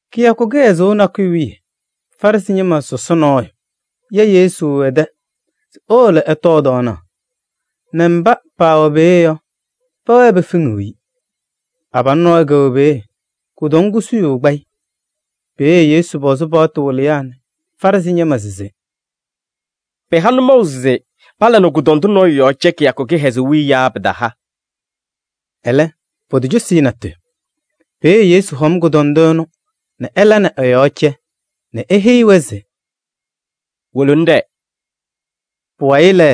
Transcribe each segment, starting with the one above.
Kɩyakʋ kɩhɛzʋʋ nakʋyʋ wiye Farɩsɩ ñɩma sɔsɔ nɔɔyʋ ya Yesu ɛ-tɛ se ewolo ɛtɔɔ tɔɔnaɣ nɛ mba paawɛ peeye yɔ, pɛwɛɛ pefeŋiɣ-i. Abalʋ nɔɔyʋ kɛwɛ peeye, kʋdɔŋ kusuyuu kpa-ɩ. Peeye Yesu pɔzɩ paɣtʋ wɩlɩyaa nɛ Farɩsɩ ñɩma se: “Pɩha nʋmɔʋ se pala nɛ kʋdɔndʋ nɔɔyʋ yɔɔ cɛ kɩyakʋ kɩhɛzʋʋ wiye yaa pataala?” Ɛlɛ potocosi-i natʋyʋ. Peeye Yesu hɔm kʋdɔndʋ ɛnʋ nɛ ɛla nɛ ɛ-yɔɔ cɛ nɛ eheyi-i se: “Wolo ŋɖɛɛ.” Pʋwayɩ lɛ,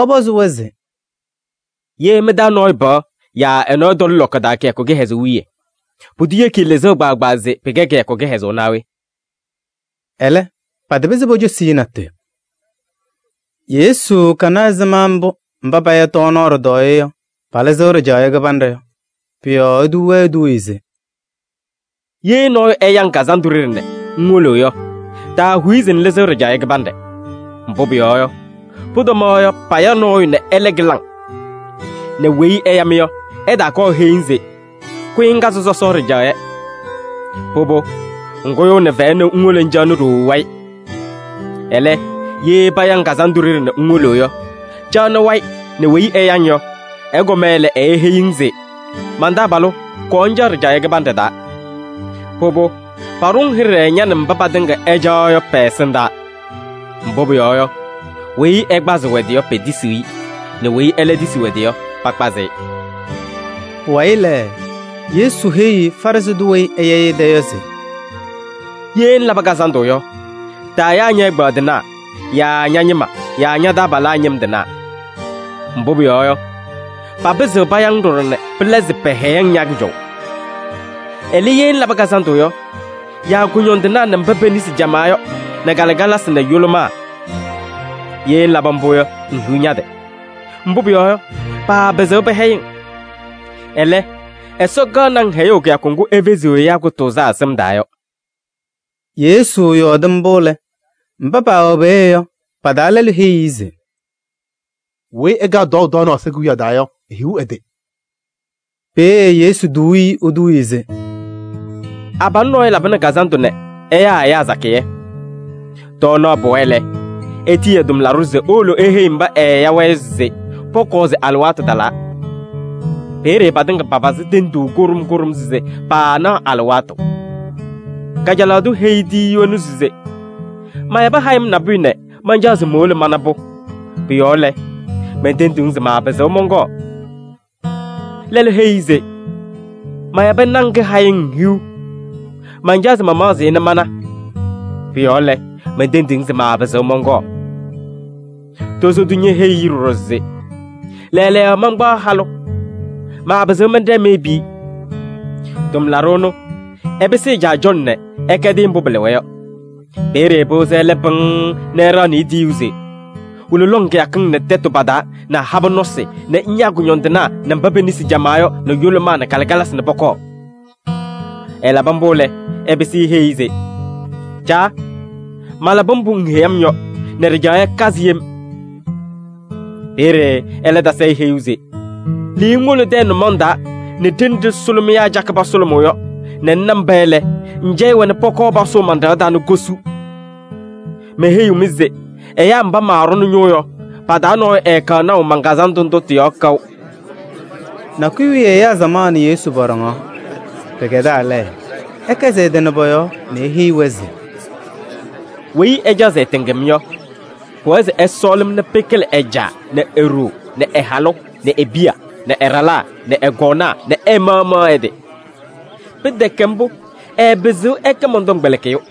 ɛpɔzɩ-wɛ se: “Ye mɩ-taa nɔɔyʋ pɩɣa yaa ɛ-nɔ ɛtɔlɩ lɔkɔ taa kɩyakʋ kɩhɛzʋʋ wiye, pʋdʋ yeki-i lɩzʋʋ kpaagbaa se pɩkɛ kɩyakʋ kɩhɛzʋʋ naa we?” Ɛlɛ patapɩzɩ pocosi-i natʋyʋ. Yesu kana ɛzɩma mbʋ mba paya tɔɔnaɣ ɖɩtɔɔyɛ yɔ, palɩzɩɣ ɖɩjaɣyɛ kɩbanɖɛ yɔ. Pʋ-yɔɔ etuu-wɛ eduuye se: “Ye nɔɔyʋ ɛya-ŋ kazandʋ ɖeɖe nɛ ŋwolo yɔ, taahuyi se ŋlɩzɩɣ ɖɩjaɣyɛ kɩbanɖɛ. Mbʋ pʋyɔɔ yɔ, pʋtɔmaɣ yɔ paya nɔɔyʋ nɛ ɛlɛ kɩlɩ-ŋ nɛ weyi ɛya-mɩ yɔ, ɛtaakɔɔ eheyi-ŋ se: ‘Kʋyɩ ŋkazɩ sɔsɔ ɖɩjaɣyɛ.’ Pʋbʋ, ŋkʋyʋʋnɩ fɛyɛ nɛ ŋwolo ŋcaɣnɩ ɖooo wayɩ. Ɛlɛ, ye paya-ŋ kazandʋ ɖeɖe nɛ ŋwolo yɔ, caɣnɩ wayɩ nɛ weyi ɛya-ŋ yɔ, ɛkɔma lɛ, eeheyi-ŋ se: ‘Man-taabalʋ! Kɔɔ ŋcaɣ ɖɩjaɣyɛ kɩbanɖɛ taa.’ Pʋbʋ, paɖʋ-ŋ hɩɖɛ ña nɛ mba patɩŋa ɩcaɣaɣ yɔ pɛ-ɛsɩndaa. Mbʋ pʋyɔɔ yɔ, weyi ɛkpazɩɣ ɛ-tɩ yɔ, petisiɣ-i nɛ weyi ɛlɛ tisiɣ ɛ-tɩ yɔ, pakpazɩ-ɩ.” Pʋwayɩ lɛ, Yesu heyi Farɩsɩ tʋ weyi ɛɛya-ɩ ɛ-tɛ yɔ se: “Ye ŋlabɩ kazandʋ yɔ, taayaa ñɛ-ɛgbaadɩnaa yaa ña-ñɩma yaa ña-taabalaa ñɩm tɩnaa. Mbʋ pʋyɔɔ yɔ, papɩzɩɣ paya-ŋ ɖɔɖɔ nɛ pɩla se pɛhɛyɩ-ŋ ña-kʋjɔʋ. Ɛlɛ, ye ŋlabɩ kazandʋ yɔ, yaa kʋñɔndɩnaa nɛ mba pe-nesi camaa yɔ nɛ kalɩkalasɩ nɛ yʋlʋmaa. Ye ŋlabɩ mbʋ yɔ, ŋhiɣ ña-tɩ! Mbʋ pʋyɔɔ yɔ, paapɩzɩɣ pɛhɛyɩ-ŋ. Ɛlɛ, Ɛsɔ kaɣnɩ-ŋ hɛyʋʋ kɩyakʋ ŋgʋ efeziɣ ɛyaa kʋtʋʋzaa sɩm taa yɔ.” Yesu yɔɔdɩ mbʋ lɛ, mba paawɛ peeye yɔ, pa-taa lɛlʋ heyi-i se: “Weyi ɛkaɣ tɔɔʋ tɔɔnaɣ Ɛsɔ Kewiyaɣ taa yɔ, ehiɣ ɛ-tɩ!” Peeye Yesu tuu-i eduuye se: “Abalʋ nɔɔyʋ labɩnɩ kazandʋ nɛ ɛyaa ɛyaa sakɩyɛ. Tɔɔnaɣ pɩwa lɛ, etiyi ɛ-tʋmlaɖʋ se ewolo eheyi mba ɛɛya-wɛ yɔ se pɔkɔɔ se alɩwaatʋ talaa. Peeye patɩŋa papazɩ tenduu kʋɖʋm kʋɖʋm se paanaɣ alɩwaatʋ. Kajalaɣ tʋ heyi tiyiyu ɛnʋ se: ‘Mayabɩ hayɩm nabʋyʋ nɛ mancaɣ se mowolo mana-pʋ. Pʋ-yɔɔ lɛ, mentendiɣ-ŋ se maapɩzɩɣ mɔnkɔɔ.’ Lɛlʋ heyi-i se: ‘Mayabɩ naŋ kɩhayɩŋ hiu, mancaɣ se mamaɣzɩ-ɩ nɛ mana. Pʋ-yɔɔ lɛ, mentendiɣ-ŋ se maapɩzɩɣ mɔnkɔɔ.’ Tozo tʋ ñeheyi-i ɖɔɖɔ se: ‘Lɛɛlɛɛyɔ mankpaɣ halʋ, maapɩzɩɣ mɛnɖɛɛ meyebi-i.’ Tʋmlaɖʋ ɛnʋ, ɛpɩsɩ ɛ-caa cɔlɔ nɛ ɛkɛdɩ-ɩ mbʋ pɩlɩwa yɔ. Peeye pɩwɩzɩ ɛlɛ pɩŋŋ nɛ ɛɖaɣnɩ-ɩ tiyuu se: ‘Wolo lɔŋ kɩyakɩŋ nɛ tɛtʋ pa-taa nɛ habɛɛ nɔsɩ nɛ ŋyaa kʋñɔndɩnaa nɛ mba pe-nesi camaa yɔ nɛ yʋlʋmaa nɛ kalɩkalasɩ nɛ pɔkɔɔ.’ Ɛlabɩ mbʋ lɛ, ɛpɩsɩ eheyi-i se: ‘Caa! Malabɩ mbʋ ŋheyi-m yɔ nɛ ɖɩjaɣyɛ kazɩ yem.’ Peeye ɛlɛ tasɩ-ɩ heyuu se: ‘Lɩɩ ŋwolo tɛyɛ nʋmɔŋ taa nɛ ɖenɖe sʋlʋmɩyaa cakɩ pasʋlʋmʋʋ yɔ nɛ ŋna mba lɛ, ŋcɛyɩ-wɛ nɛ pɔkɔɔ pasʋʋ man-ɖɩɣa taa nɛ kosu. Meheyiɣ-mɩ se ɛyaa mba maaɖʋnɩ ñʋʋ yɔ, pa-taa nɔɔyʋ ɛɛkaɣ naʋ man-kazandʋ ndʋ tɩ-yɔɔ kaʋ.’” Nakʋyʋ wiye ɛyaa samaɣ nɛ Yesu pɔɖɔŋaɣ. Pɩkɛdaa lɛ, ɛkɛzɩ ɛ-tɩ nɛ pɔ-yɔɔ nɛ eheyi-wɛ se: “Weyi ɛcaɣ se ɛtɩŋ-m yɔ, pʋwɛɛ se ɛsɔɔlɩ-m nɛ pɩkɩlɩ ɛ-caa nɛ e-ɖoo nɛ ɛ-halʋ nɛ e-piya nɛ ɛ-ɖalaa nɛ ɛ-kɔɔnaa nɛ ɛ-maɣmaɣ ɛ-tɩ. Pɩtɛkɛ mbʋ, ɛɛpɩzɩɣ ɛkɛ mɔn-tɔmkpɛlɩkɩyʋ.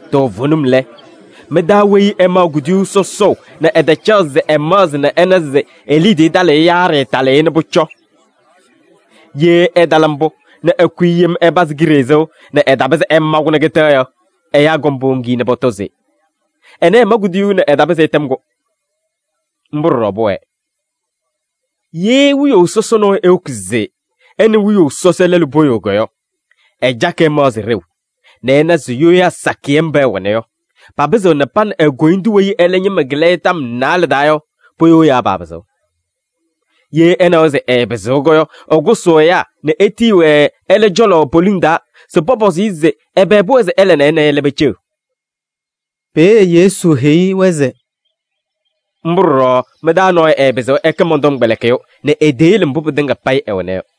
Toovenim lɛ, mɩ-taa weyi ɛmaɣ kuduyuu sɔsɔʋ nɛ ɛtacaɣ se ɛmaɣzɩ nɛ ɛna se e-liidiye talɩɣ-ɩ yaa ɖɩɩtalɩɣ-ɩ nɛ pʋcɔ? Ye ɛtala mbʋ nɛ ɛkʋyɩ yem ɛpazɩ kiɖe sɩʋ nɛ ɛtapɩzɩ ɛma-kʋ nɛ kɩtɛ yɔ, ɛyaa kɔŋ powoŋ-i nɛ pɔtɔ se: ‘Ɛnɛ ɛma kuduyuu nɛ ɛtapɩzɩ ɛtɛm-kʋ.’ Mbʋ ɖɔɖɔ pʋwɛɛ. Ye wiyaʋ sɔsɔ nɔɔyʋ ewoki se ɛ nɛ wiyaʋ sɔsɔ lɛlʋ poyoo yɔ, ɛcakɩ ɛmaɣzɩ ɖeu nɛ ɛna se yoyaa sakɩyɛ mba ɛwɛna yɔ, papɩzɩɣ nɛ pa nɛ e-koyindu weyi ɛlɛ ñɩma kɩlɩ-ɩ tɔm naalɛ taa yɔ, poyoo yaa paapɩzɩɣ. Ye ɛnawa se ɛɛpɩzɩɣ yɔ, ɛkʋsʋʋ ɛyaa nɛ etiyi-wɛ ɛlɛ cɔlɔ poliŋ taa se pɔpɔzɩ-ɩ se ɛbɛ pʋwɛɛ se ɛla nɛ ɛ nɛ ɛlɛ peceɣ.” Peeye Yesu heyi-wɛ se: “Mbʋ ɖɔɖɔ mɩ-taa nɔɔyʋ ɛɛpɩzɩɣ ɛkɛ mɔn-tɔmkpɛlɩkɩyʋ nɛ eteyele mbʋ pɩtɩŋa payɩ ɛwɛna yɔ.”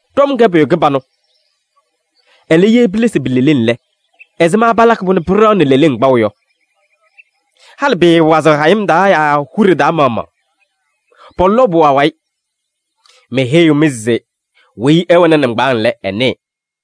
“Ɖɔm kɛ pʋyʋ kɩbanʋ. Ɛlɛ, ye pilesi pi-leleŋ lɛ, ɛzɩma palakɩ-pʋ nɛ pɩɖaɣnɩ leleŋ kpaʋ yɔ? Halɩ pɩɩwazɩɣ hayɩm taa yaa huɖe taa maɣmaɣ. Pɔlɔʋ-pʋ awayɩ. Meheyiɣ-mɩ se weyi ɛwɛnɩ nɩŋgbaaŋ lɛ, ɛnɩɩ.”